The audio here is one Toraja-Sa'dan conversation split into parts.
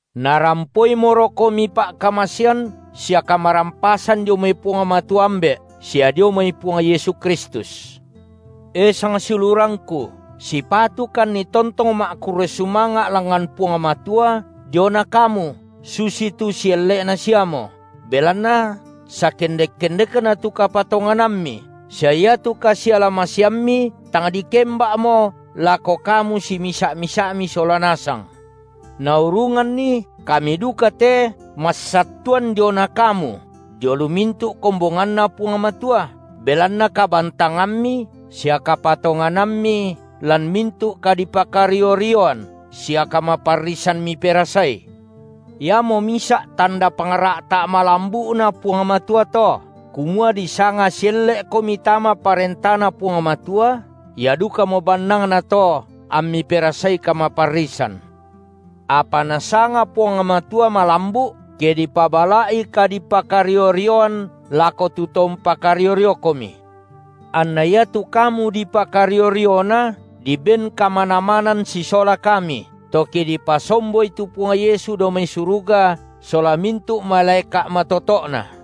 Narampoimorokomi pa’kamasean sia kamarampasan dio mai Puang Matua, Ambe’, sia dio mai Puang Yesu Kristus. E sangsiulurangku, sipatukanni tontong ma’kurre sumanga’ langngan Puang Matua diona kamu, susitu sielle’na siamo, belanna sakendek-kendekna tu kapatonganammi sia iatu kasialamaseammi tang dikemba’mo lako kamu simisa’-misa’mi sola nasang, naurunganni kami duka te massattuan diona kamu dio lu mintu’ kombonganNa Puang Matua, belanna kabantangammi sia kapatonganammi lan mintu’ kadipakario-rioan sia kamaparrisan miperasai. Iamo misa’ tanda pangra’ta’ malambu’Na Puang Matua to, kumua disanga sielle’komi tama ParentaNa Puang Matua, ia dukamo bannangna to ammi perasai kamaparrisan: Apa Nasanga Puang Matua malambu’ ke dipabala’i kadipakario-rioan lako tu to umpakario-riokomi, anna iatu kamu dipakario-riona diben kamanamanan sisola kami, to ke dipasomboi tu Puang Yesu dao mai suruga sola mintu’ malaeka’ matoto’Na,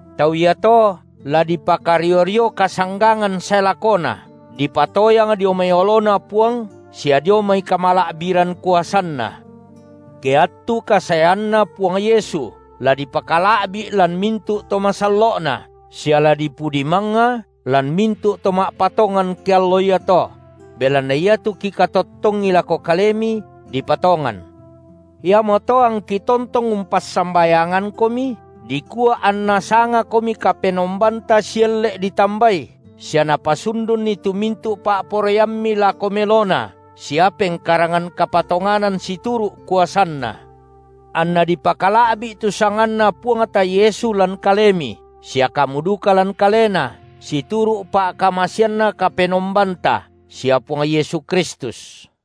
Tau iato la dipakario-rio kasanggangan sae lakona, dipatoyang dio mai oloNa Puang sia dio mai kamala’biran kuasanNa, ke attu kasaeanNa Puang Yesu la dipakala’bi’ lan mintu’ to masallo’Na, sia la dipudi mangnga lan mintu’ to ma’patongan ke allo iato; belanna iatu kikatottongi lako kalemi, dipatongan. Iamoto angki tontong umpassambayangankomi, dikua anNa sangakomi Kapenombanta sielle’ ditambai sia Napasundunni tu mintu’ pa’poraiammi lako melona sia pengkarangan kapatonganan situru’ kuasanNa, anna dipakala’bi’ tu sanganNa Puangta Yesu lan kalemi sia kamu duka lan Kalena, situru’ pa’kamaseanNa Kapenombanta sia Puang Yesu Kristus.